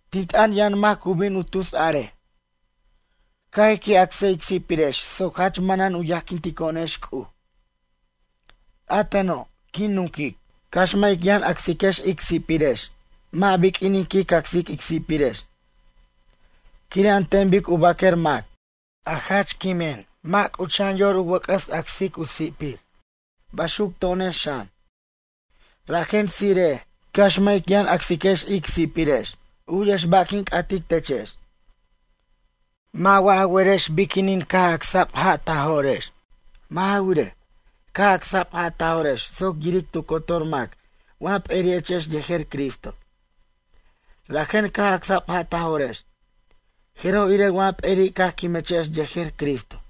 Tin t'ʌn yʌn mac cu bin u tus a'arej: “Ca' ij qui' acs ic si'pirex soc jach manan u yajquintico'onex C'uj.” A teno', quin nunquic. Cax mʌ' ic yʌn acsiquex ic si'pirex, mʌ' biq'uinin quic acsic ic si'pirex, quire' an ten bic u baquer mac, a jach quimin mʌ' c'ucha'an yor u wʌc'ʌs acs u sipiri', baxuc to'onex xan. Rajen tsire'ej, cax mʌ' ic yʌn acsiquex ic si'pirex. U'yex ba' quin c'atic techex. Mʌ' wa ja werex biquinin caj acsa'b ja' ta jo'rex? Mʌ' ja wirej, caj acsa'b ja' ta jo'rex soc yiric tu cotor mac wa p'eri'echex yejer Cristo. Rajen caj acsa'b ja' ta jo'rex, jeroj irej wa p'eri' caj quimechex yejer Cristo.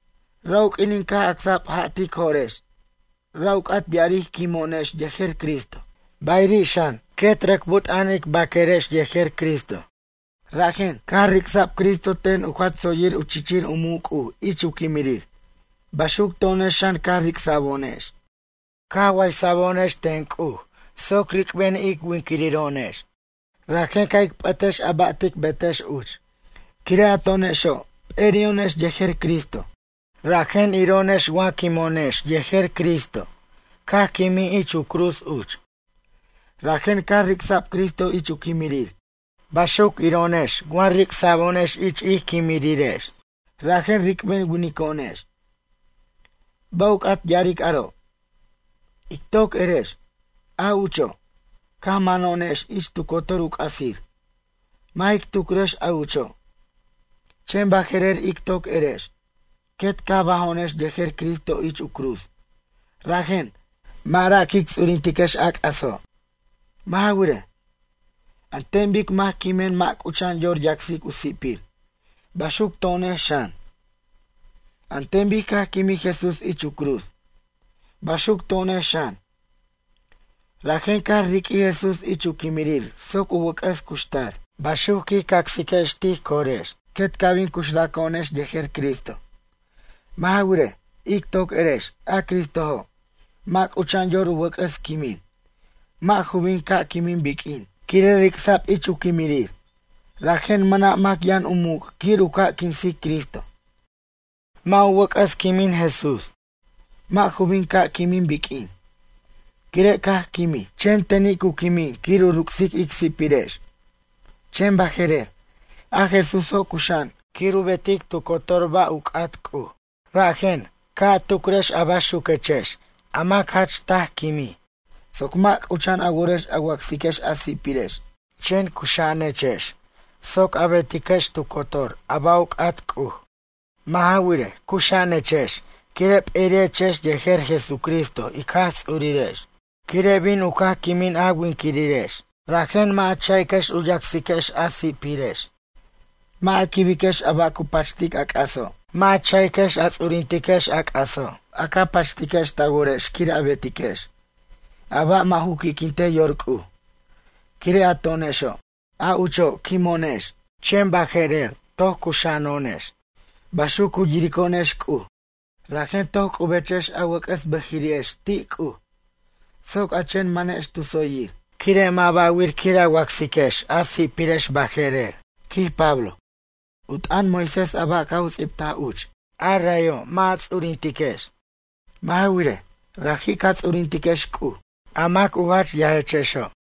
Ra' u q'uinin caj acsa'b ja' tic jo'rex, ra' u c'at ya'aric quimo'onex yejer Cristo. Bayiri' xan, quet rʌc but'a'an ic baquerex yejer Cristo. Rajen, caj ric'sa'b Cristo ten u jach tsoyir u chichir u muc' C'uj ich u quimirir, baxuc to'onex xan caj ric'sa'bo'onex, caj waysa'bo'onex ten C'uj soc ric'ben winiquiro'onex. Rajen ca' ic p'ʌtex a ba' tic betex uch. Quire' a to'onexo', p'eri'o'onex yejer Cristo, rajen, iro'onex wa quimeno'onex yejer Cristo caj quimij ich u cruz uch. Rajen caj ric'sa'b Cristo ich u quimirir, baxuc iro'onex wa ric'sa'bo'onex ich ic quimirirex, rajen ric'ben winico'onex. Ba' u c'at ya'aric aro'? Ic toc erex, a ucho', caj mano'onex ich tu cotor u c'asir, mʌ' jic tucrex a ucho', chen baje'rer ic toc erex, quet caj bajo'onex yejer Cristo ich u cruz, rajen, mʌ' ra' quic ts'urintiquex a c'aso'. Mʌ' ja wirej, an ten bic mac quimen mʌ' c'ucha'an yor yacsic u sipir, baxuc to'onex xan. An ten bic caj quimij Jesús ich u cruz, baxuc to'onex xan, rajen caj riq'uij Jesús ich u quimirir soc u wʌc'ʌs cuxtar. Baxuc quij cacsiquex tij corex quet ca' bin cuxraco'onex yejer Cristo. Mʌ' ja wirej, ic toc erex, a Cristojo', mʌ' c'ucha'an yor u wʌc'ʌs quimin, mʌ' ju bin ca' quimin biq'uin, quire' ric'sa'b ich u quimirir, rajen mʌna' mac yʌn u muc' quir u ca' quinsic Cristo. Mʌ' ju wʌc'ʌs quimin Jesús, mʌ' ju bin ca' quimij biq'uin, quire' caj quimij, chen teni' cu quimin quir u ruc'sic ic si'pirex. Chen baje'rer, a Jesúso' cuxa'an quir u betic tu cotor ba' u c'at C'uj. Rajen, ca' a tucrex a baxuquechex a mac jach taj quimij, soc mʌ' c'ucha'an a worex a wacsiquex a si'pirex, chen cuxa'anechex soc a betiquex tu cotor a ba' u c'at C'uj. Mʌ' ja wirej, cuxa'anechex quire' p'eri'echex yejer Jesucristo ic Jaj Ts'urirex. Quire' bin u caj quimin a winquirex, rajen mʌ' ja cha'iquex u yacsiquex a si'pirex, mʌ' a quibiquex a ba' cu pachtic a c'aso'. Mʌ' ja cha'iquex a ts'urintiquex c'aso' a ca pachitiquex ta worex quir a betiquex, a ba' mʌ' ju qui'quintej yor C'uj. Quire' a to'onexo', a ucho', quimo'onex, chen baje'rer toc cuxa'ano'onex, baxuc cu yirico'onex C'uj. Rajen toc c'ubechex a wʌc'ʌs bʌjiri'ex ti' C'uj, soc a chen manex tu tsoyir. Quire' mʌ' ba'wir quir a wacsiquex a si'pirex baje'rer, quij Pablo, u t'ʌn Moisés a ba' caj u ts'ibtaj uch, rayo' mʌ' ja ts'urintiquex. Mʌ' ja wirej, raji' ca ts'urintiquex C'uj, a mac a jach yajechexo'.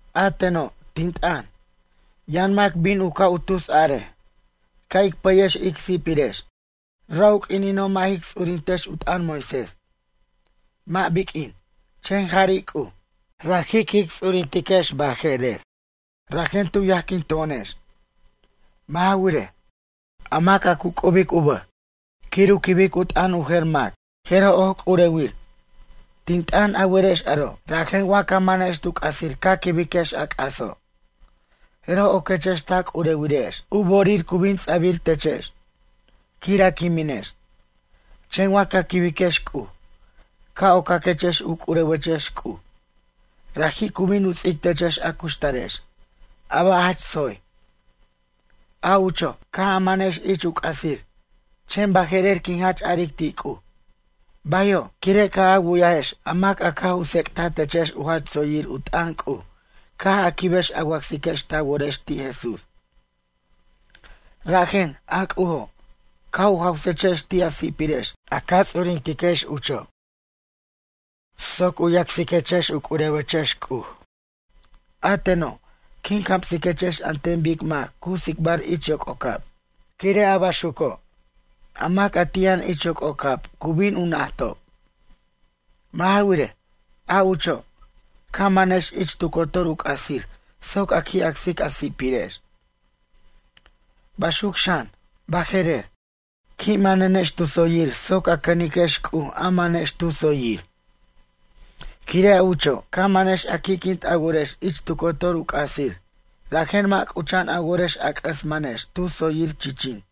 A teno', tin t'ʌn, yʌn mac bin u ca' u tus a'arej: “Ca' ic pʌyex ic si'pirex, ra' u q'uinino' mʌ' jic ts'urintex u t'ʌn Moisés, mʌ' biq'uin, chen jari' C'uj, raji' quic ts'urintiquex baje'rer, rajen tu yajquin to'onex?” Mʌ' ja wirej, a mac a cu c'ubic u bʌj, quir u quibic u t'ʌn u jer mac, jeroj oc c'urewir. Tin t'ʌn, a werex aro', rajen wa ca manex tu c'asir ca quibiquex a c'aso', jeroj oquechex ta c'urewirex. U bo'orir cu bin ts'abir techex, quir a quiminex. Chen wa ca quibiquex C'uj, ca' ocaquechex u c'urewechex C'uj. Raji' cu bin u ts'ic techex a cuxtarex, a ba' jach tsoy. A ucho', caj a manex ich u c'asir, chen baje'rer quin jach a'aric ti' C'uj: “Bayo'”, quire' caj a wu'yajex a mac a caj u tsec'taj techex u jach tsoyir u t'ʌn C'uj caj a quibex a wacsiquex ta worex ti' Jesús. Rajen, a C'ujo', caj u jawsechex ti' a si'pirex a ca ts'urintiquex ucho', soc u yacsiquechex u c'urewechex C'uj. A teno', quin camsiquechex an ten bic mac cu tsicbar ich yoc'ocab, quire' a baxuco', a mac a ti' yʌn ich yoc'ocab cu bin u najtob. Mʌ' ja wirej, a ucho', ca manex ich tu cotor u c'asir soc a qui' acsic a si'pirex. Baxuco' xan, baje'rer, qui' manenex tu tsoyir soc a cʌniquex C'uj a manex tu tsoyir. Quire' a ucho', ca manex a qui'quint a worex ich tu cotor u c'asir, rajen mʌ' c'ucha'an a worex a c'ʌs manex tu tsoyir, chichin.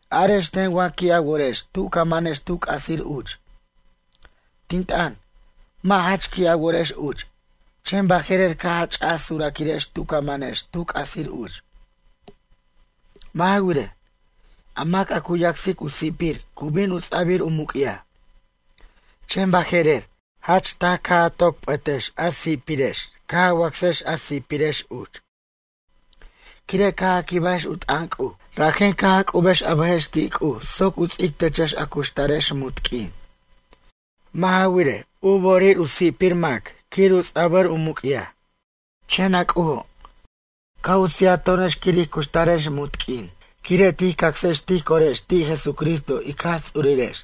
Arex ten wa qui' a worex tu ca manex tu c'asir uch. Tin t'ʌn, mʌ' jach qui' a worex uch, chen baje'rer caj a ch'aj suraquirex tu manechex tu c'asir uch. Mʌ' ja wirej, a mac a cu yacsic u si'pir cu bin u ts'a'bir u muc'yaj. Chen baje'rer, jach taj caj a toc p'ʌtex a si'pirex caj a wacsex a si'pirex uch, quire' caj a quibajex u t'ʌn C'uj. Rajen caj a c'ubex a bʌjex ti' C'uj soc u ts'ic techex a cuxtarex munt q'uin. Mʌ' ja wirej, u bo'orir u si'pir mac quir u ts'abir u muc'yaj. Chen a C'ujo', caj u sijato'onex quir ij cuxtarex munt q'uin quire' tij cacsex tij corex ti' Jesucristo ic Jaj Ts'urirex.